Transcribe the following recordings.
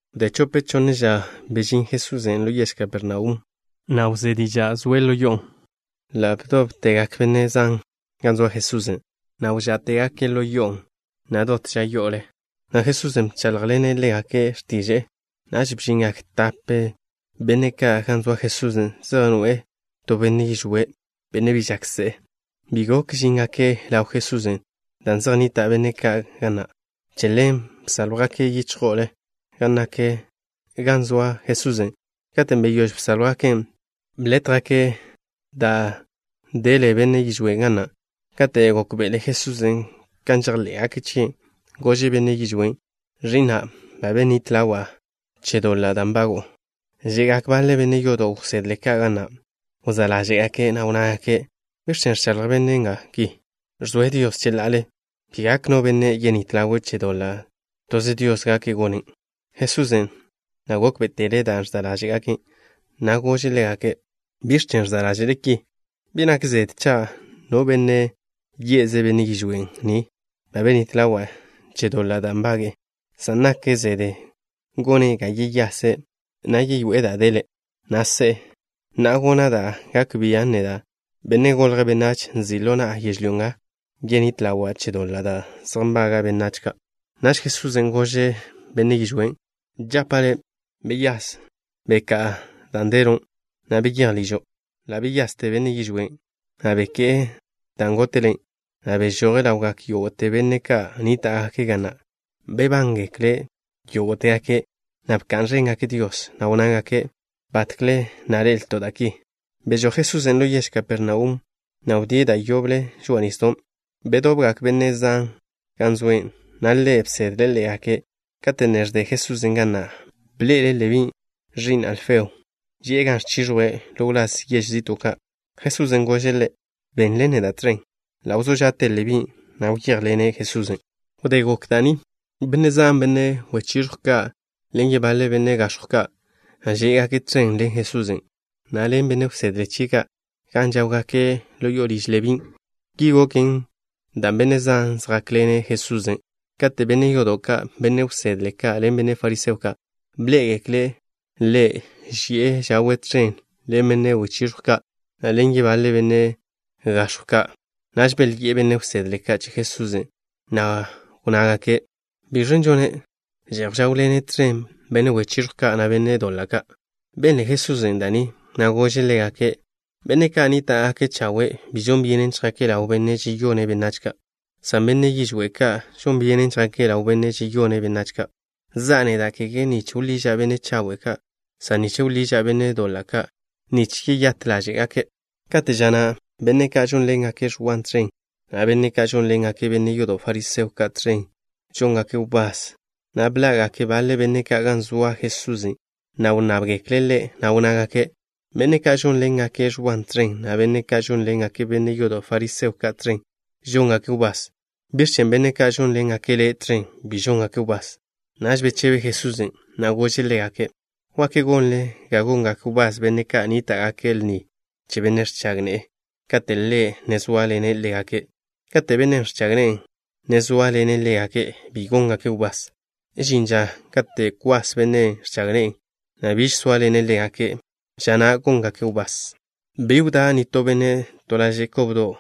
Wdé chope chonne ža, beyáz Jesusen' ḻo yež Kapernaum, na' wzé diža' zoe' ḻo yo'o. Ḻa' bdóbtegak benne' zan gan zoa Jesusen', na' zejte biž gok chejnníta'gake' ga na', na' kege ža yo'o, na' Jesusen' bcháḻjḻene' ḻégake' x̱tiže'e. Naž bžingak tape benne' ka' gan zoa Jesusen', zej noe'e to benne' yižwé', benne' bi žak se'e. Bi gok žíngake' ḻaw Jesusen' dan' zej nnita' benne' zan ka' ga na'. Che ḻen bsáljwgake' yichjo'o gan nak ḻaw Jesusen'. Katen' beyóž bsáljwgaken', blétjgake' da' dele benne' yižwén' ga na'. Kate' gókbe'ele Jesusen' kan žejḻé'gake' chie', gože' benne' yižwén': —Ẕi'na', ba benít ḻawa' le' che doḻa' da' nbago'o. Že'gak baḻe benne' yodo' wsedle ka' ga na'. Wzá' ḻáže'gake', na' wnnágake': “¿Biẕ chen' ẕchaḻj bennen' ki? Ẕzoe' Dios cheḻa'ale. Bi gak no benne' yenít ḻawe' che doḻa'. Toze Dios gak gonen'.” Jesusen' ḻa' gókbe'etele' da' ẕza' ḻáže'gake', na' gože' ḻégake': —¿Biẕ chen' ẕza' ḻáže'le ki? Bi nak zede cha' no benne' ye'ze' benne' yižwé' ni ba benít ḻawe' che doḻa' da' nbage'e, san nak zede gone' ga yeyase', na' we'e da' dele', na' se'e. Na'a gona' da' gak bia' neda', Benne' Golje' Benách, nzi' ḻo na'a yežlyó nga yenít ḻawa' che doḻa' da' zej nbaga' benách ka'. Naž Jesusen' gože' benne' yižwén': —Žapa' le': Wyase. Beká'a da' delo', na' beyéj ližo'. Ḻa' wyaste benne' yižwén', na' beké'e da' góte'le', na' bežoje' ḻawgak yógo'te benne' ka' nníta'gake' ga na'. Bebángekle' yógo'tegake', na' bka'n ẕéngake' Dios, na' wnnágake': —Batkle na' ḻe'elto' da' ki. Bežój Jesusen' ḻo yež Kapernaum, na' wdíe' da' yoble žoa'a nisdon'. Bedobgak benne' zan gan zoe', na' Ḻe' bsedle' ḻégake'. Kate' ne ẕde Jesusen' ga na', bḻe'ele' Lebí, ẕi'n Alfeo, ži'e gan ẕchiẕjwe' ḻo wláz yež zi'to'. Jesusen' gože' ḻe': —Benḻen neda' tẕen. Ḻa' wzó ža'te Lebín', na' wyéjḻene' Jesusen'. Wdé gok da' ni, benne' zan, benne' wechiẕjw ka' ḻen yebaḻe benne' gax̱jw ka' žé'gake' tẕen ḻen Jesusen', na' ḻen benne' wsedle chie' ka' gan žáwgake' ḻo liž Lebín'. Ki goken dan' benne' zan žjákḻene' Jesusen'. Kate' benne' yodo' ka', benne' wsedle ka' ḻen benne' fariseo ka', bḻé'egekle' Ḻe' ži'e žawe' tẕen ḻen benne' wechiẕjw ka', na' ḻen yebaḻe benne' gax̱jw ka', naž belyi'e benne' wsedle ka' che Jesusen', na' wnnágake': —¿Bižen' žone'? Že'j žáwḻene' tẕen benne' wechiẕjw ka', na' benne' doḻa' ka'. Benle Jesusen' da' ni, na' gože' ḻégake': —Benne' ka' nníta'gake' chawe' bi žon byenen chjake' ḻaw benne' žeyone' benách ka', san benne' yižwé' ka' žon byenen chjake' ḻaw benne' žeyone' benách ka'. Za'a neda', kege nich wḻiža' benne' chawe' ka', san nich wḻiža' benne' doḻa' ka', nich yeyát ḻáže'gake'. Kate' ža na' benne' ka' žónḻengake' Ẕwa tẕen, na' benne' ka' žónḻengake' benne' yodo' fariseo ka' tẕen, žóngake' wbás, na' bḻa'gak baḻe benne' ka' gan zoa Jesusen', na' wnnábgekle' Ḻe', na' wnnágake': —Benne' ka' žónḻengake' Ẕwan' tẕen, na' benne' ka' ẕónḻengake' benne' yodo' fariseo ka' tẕen, žóngake' wbás. ¿Biẕ chen' benne' ka' žónḻengake' Le' tẕen bi žóngake' wbás? Naž bechebe Jesusen', na' gože' ḻégake': —¿Wak gonle ga gongak wbás benne' ka' nníta'gake' lni che benne' ẕchag ne'e kate' ḻe' ne zóaḻene' ḻégake'? Kate' bennen' ẕchag ne'e ne zóaḻene' ḻégake', bi góngake' wbás. Žin ža kate' kwas bennen' ẕchag ne'e, na' biž sóaḻene' ḻégake'. Ža na' góngake' wbás. ’Bi wdá' nitó benne' to laže' kobdo'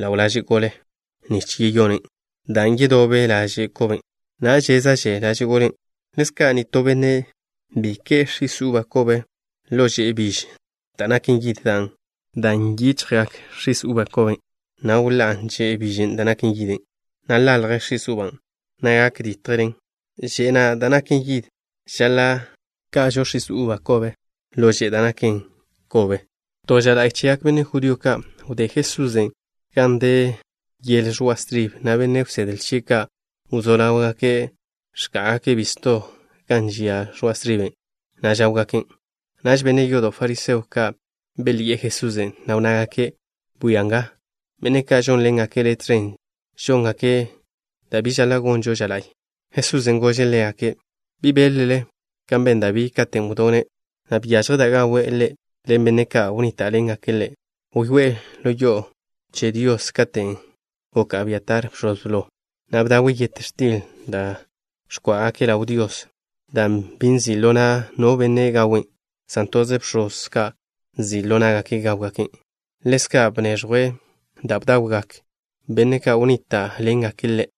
ḻo laže' gole nich yeyonen', dan' yedobe laže' koben', na' wžezan' laže' golen', na' chéza'že laže' golen'. Ḻezka', nitó benne' bi ke'e x̱is uba kobe ḻo že'e biž da' naken yid, dan' gak bḻa'a x̱is uba koben', na' wḻá'a že'e bižen' da' naken yid, na' ḻalje x̱is uban', na' gak ditje že'e na' da' naken yid. Žaḻa' ka'žo x̱is uba kobe ḻo že'e da' naken yid kobe. To ža la'y chegak benne' judío ka', wdé Jesusen' gan de yele ẕoa' stribe, na' benne' wsedle chie' ka' wzó ḻáwgake' ẕká'gake' bisto gan žia ẕoa' striben', na' žáwgaken'. Naž benne' yodo' fariseo ka' belyi'e Jesusen', na' wnnágake': —Bwia nga. Benne' ka' žónḻengake' Le' tẕen žóngake' da' bi žaḻa' gonžo ža la'y. Jesusen' gože' ḻégake': —¿Bi beḻ-le kan ben Dabí katen' wdone', na' byažje da' gawe' ḻe' ḻen benne' ka' wnníta'ḻengake' ḻe'? Wyoé'e ḻo yo'o che Dios katen' gok Abiatar bx̱oz blo, na' bdawe' yet x̱til da' ẕkó'ogake' ḻaw Dios, dan' bi nzi' ḻo na' no benne' gawen', san toze bx̱oz ka' nzi' ḻo ná'gake' gáwgaken'. Ḻezka' bneẕjwe' da' bdawgak benne' ka' wnníta'ḻengake' ḻe'.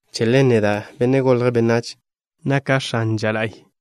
Che ḻen, neda', Benne' Golje' Benách, naka' x̱ane ža la'y.